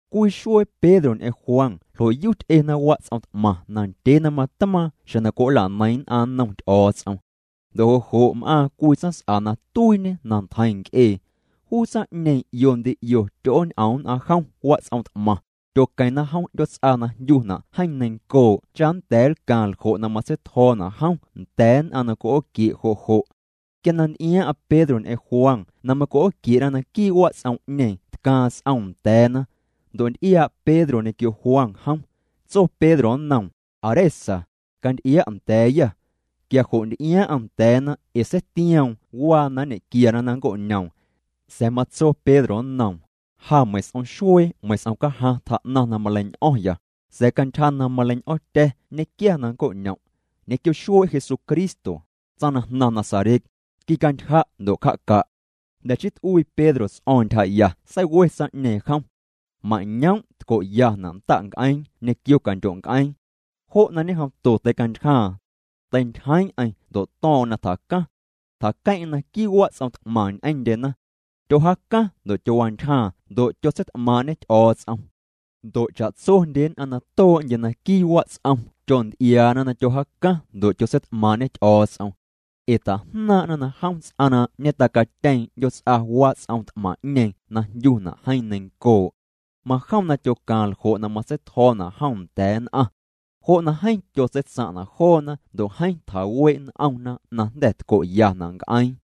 Cwii xuee Pedro ñ'eⁿ Juan ljo'yu ty'ena wats'om t'maⁿ na ndyee na matmaaⁿ xjeⁿ na cwi'oola'neiⁿ nn'aⁿ nnom Ty'o̱o̱ts'om. Ndo' jo' jo' m'aaⁿ cwii tsaⁿs'a na tuiiñe na ntjeiⁿ nc'ee. Juu tsaⁿ'ñeeⁿ 'io ndi 'io tyo'ooñ'om nn'aⁿ jom wats'om t'maⁿ, tyoqueⁿna jom 'ndyoots'a na jndyuna' Jeeⁿ Neiⁿncoo' cha nnda̱a̱ nlcaaⁿ ljo' na matseitjo̱o̱na' jom nda̱a̱ nn'aⁿ na cwi'ooquie' jo' jo'. Quia na nty'iaaⁿ'aⁿ Pedro ñ'eⁿ Juan na macwi'ooquie'na naquii' wats'om'ñeeⁿ tcaaⁿ s'om nda̱a̱na. Ndo' nty'iaa' Pedro ñequio Juan jom. Tso Pedro nnoom: —Aa re sa, canty'ia' nda̱a̱yâ. Quia jo' nty'iaaⁿ'aⁿ nda̱a̱na ee seitioom waa na nñequiana na nnco'ñoom. Sa̱a̱ matso Pedro nnoom: —Ja meiⁿ s'om xuee meiⁿ s'om cajaⁿ tjaa'naⁿ na maleiñ'o̱ⁿya, sa̱a̱ cantyja na maleiñ'o̱ⁿtya̱ nñequiaya na nnco'ñom'. Ñequio xuee' Jesucristo, tsaⁿ na jnaⁿ Nazaret, quicantyja' ndo' cja'ca'. Jnda̱ chii t'uii Pedro ts'o̱o̱ⁿ ntyjaya seiwe tsaⁿ'ñeeⁿ jom. Mañoom' tco'yana' nda'nc'eeⁿ ñequio candyo'nc'eeⁿ. Jo' na ñejomto teicantyjaaⁿ. Teintyjeeⁿ'eⁿ ndo' to̱o̱ⁿ'o̱ⁿ na tjacaⁿ. Tjaqueⁿ'eⁿ naquii' wats'om t'maⁿ ñ'eⁿndyena. Tyojaacaⁿ ndo' tyowantyjaaⁿ ndo' tyotseit'maaⁿ'ñê Ty'o̱o̱ts'om. Ndo' cha'tsondye nn'aⁿ na too'ndye naquii' wats'om tyonty'iaana na tyojaacaⁿ ndo' tyotseit'maaⁿ'ñê Ty'o̱o̱ts'om. Ee tajnaaⁿ'na na jom ts'aⁿ na ñetacatyeeⁿ 'ndyoots'a wats'om t'maⁿ'ñeeⁿ na jndyuna' Jeeⁿ Neiⁿncoo'. Majom na tyocaaⁿ ljo' na matseitjo̱o̱na' jom nda̱a̱ nn'aⁿ. Jo' na jeeⁿ tyotseitsaⁿ'na' joona ndo' jeeⁿ tjawee' n'omna na jnda̱ tco'yana' nc'eeⁿ.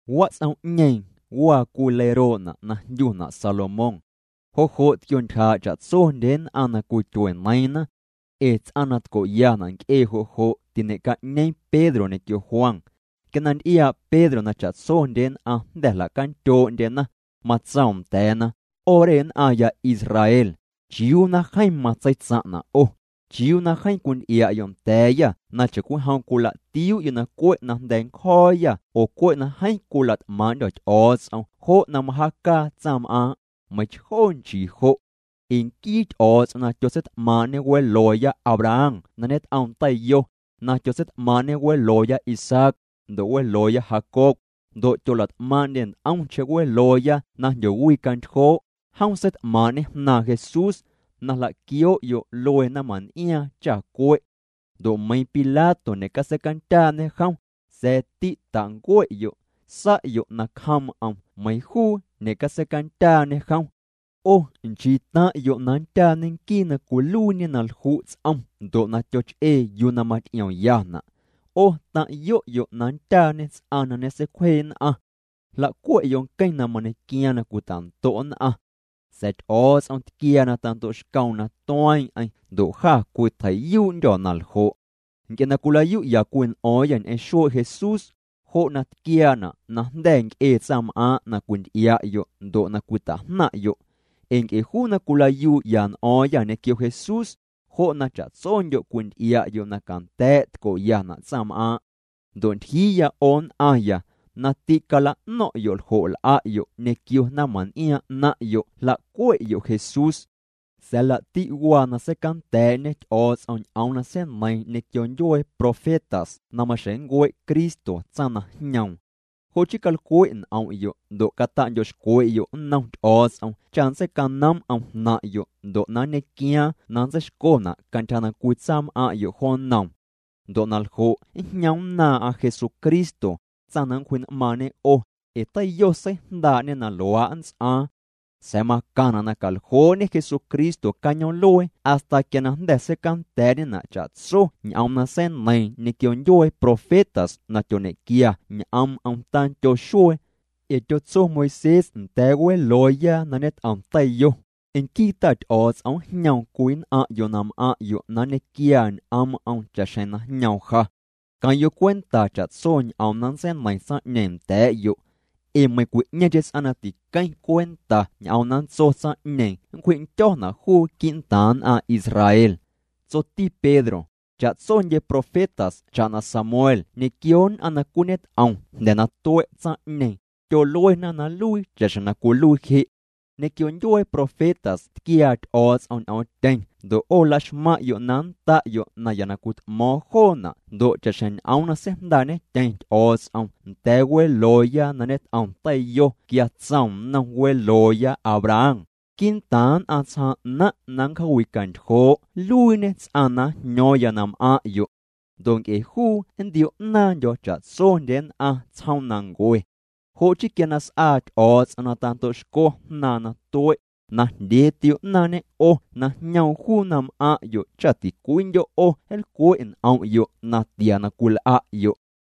Wats'om'ñeeⁿ waa cwii leiroo'na' na jndyuna' Salomón. Jo' jo' tquiontyjaa' cha'tsondye nn'aⁿ na cwityueneiiⁿna. Ee ts'aⁿ na tco'yana' nc'ee jo' jo' tiñe'ca'ñeeⁿ Pedro ñequio Juan. Quia na nty'iaa' Pedro na cha'tsondye nn'aⁿ jnda̱ jla'candyoo'ndyena, matsoom nda̱a̱na: —'O re nn'aⁿya Israel, ¿chiuu na jeeⁿ matseitsaⁿ'na' 'o? ¿Chiuu na jeeⁿ cwinty'ia'yo' nda̱a̱yâ na chacwijom cwila'tiuu'yo' na cwe' na jnda̱a̱ ncjo̱o̱yâ oo cwe' nc'e na jeeⁿ cwila't'maaⁿ'ndyô̱ Ty'o̱o̱ts'om jo' na majaacaa tsaⁿm'aaⁿ'? Meiⁿchjoo nchiijo'. Ee nquii Ty'o̱o̱ts'om na tyotseit'maaⁿ'ñe welooya Abraham na ñet'oom teiyo, na tyotseit'maaⁿ'ñe welooya Isaac, ndo' welooya Jacob, ndo' tyola't'maaⁿ'ndye nt'omcheⁿ welooya na jndyowi'cantyjoo', jom seit'maaⁿ'ñê Jnaaⁿ Jesús, na jla'quioo'yo' luee naⁿmaⁿn'iaaⁿ cha cue'. Ndo' meiiⁿ Pilato ñe'catseicandyaañe jom, sa̱a̱ tîtancue'yo'. Sa'yo' nacjoom'm meiiⁿ juu ñe'catseicandyaañe jom. 'O nchii taⁿ'yo' na nndyaañe nquii na cwiluiiñe na lju' ts'om ndo' na tyoch'ee yuu na maty'iomyana'. 'O taⁿ'yo'yo' na nndyaañe ts'aⁿ na ñeseicwjee nn'aⁿ. Jla'cue'yo' nqueⁿ na mañequiaaⁿ na cwitando' nn'aⁿ. Sa̱a̱ Ty'o̱o̱ts'om tquiaa na tando'xcoom na tueeⁿ'eⁿ ndo' jâ cwitjei'yuu'ndyô̱ na ljo'. Nc'e na cwilayu'ya cwii n'o̱o̱ⁿyâ ñ'eⁿ xuee' Jesús, jo' na tquiaana' najnda̱ nc'ee tsaⁿm'aaⁿ' na cwinty'ia'yo' ndo' na cwita'jnaⁿ'yo'. Ee nc'e juu na cwilayuu'yâ n'o̱o̱ⁿyâ ñequio Jesús, jo' na cha'tsondyo' cwinty'ia'yo' na canda̱a̱' tco'yana' tsaⁿm'aaⁿ'. ’Ndo' ntyjiiya, 'o nn'aⁿya, na tîcala'no̱ⁿ'yo' ljo' l'a'yo' ñequio naⁿmaⁿn'iaaⁿ 'naⁿ'yo' jla'cue'yo' Jesús. Sa̱a̱ laa'ti' waa na seicanda̱a̱'ñe Ty'o̱o̱ts'om ñ'oom na seineiiⁿ ñequio ndyuee profetas na maxjeⁿ nncue' Cristo tsaⁿ na jñoom. Jo' chii calcwe' n'om'yo' ndo' cata'ndyo'xcwe'yo' nnom Ty'o̱o̱ts'om cha nntseicanoom'm jnaⁿ'yo' ndo' na nñequiaaⁿ na ntseixcona' cantyja na cwitsaam'aⁿ'yo' joo nnoom. Ndo' na ljo' njñomnnaaⁿ'aⁿ Jesucristo, tsaⁿ na nncwji'n'maaⁿñe 'o, ee teiyo seijndaa'ñê na luaa' nnts'aaⁿ. Sa̱a̱ macaⁿna' na caljoo'ñe Jesucristo cañoom'luee hasta quia na jnda̱ seicanda̱a̱'ñena' cha'tso ñ'oom na seineiiⁿ ñequio ndyuee profetas na tyoñequia ñ'oom'm tandyo xuee. Ee tyotso Moisés nda̱a̱ welooya na ñet'om teiyo: “Nquii Ta Ty'o̱o̱ts'om njñoom cwii nn'aⁿ'yo' na m'aⁿ'yo' na nñequiaa ñ'oom'm cha'xjeⁿ na jñoom ja. Queⁿ'yo' cwenta cha'tso ñ'oom na nntseineiⁿ tsaⁿ'ñeeⁿ nda̱a̱'yo'. Ee meiⁿcwi'ñeeⁿcheⁿ ts'aⁿ na tiqueⁿ cwenta ñ'oom na nntso tsaⁿ'ñeeⁿ nncwji'ndyo̱na' juu quii'ntaaⁿ nn'aⁿ Israel.” Tsoti Pedro: —Cha'tsondye profetas cha'na Samuel ñequio nn'aⁿ na cwiñet'om jnda̱ na tue' tsaⁿ'ñeeⁿ, tyoluena na nluii cha'xjeⁿ na cwiluii je'. Ñequio ndyuee profetas tquiaa Ty'o̱o̱ts'om ñ'oomtyeⁿ ndo' 'o laxmaⁿ'yo' na nnda'yo' naya na cwit'mo̱o̱ⁿ joona' ndo' cha'xjeⁿ ñ'oom na seijndaa'ñetyeⁿ Ty'o̱o̱ts'om nda̱a̱ welooya na ñet'om teiyo quia tsoom nnom welooya Abraham: “Quii'ntaaⁿ nn'aⁿ tsjaaⁿ 'naⁿ' na nncjaawi'cantyjoo' nluiiñe ts'aⁿ na njño̱o̱ⁿya na m'aⁿ'yo'. Ndo' nc'e juu nntio'naaⁿndyo̱ cha'tsondye nn'aⁿ tsjoomnancue.” Jo' chii quia na s'aa Ty'o̱o̱ts'om na ta'ndo'xco Jnaaⁿ na tue', najndyee tio'naaⁿñê 'o na jñoom juu na m'aⁿ'yo' cha tincwiindyo' 'o nlcwe' n'om'yo' natia na cwil'a'yo'.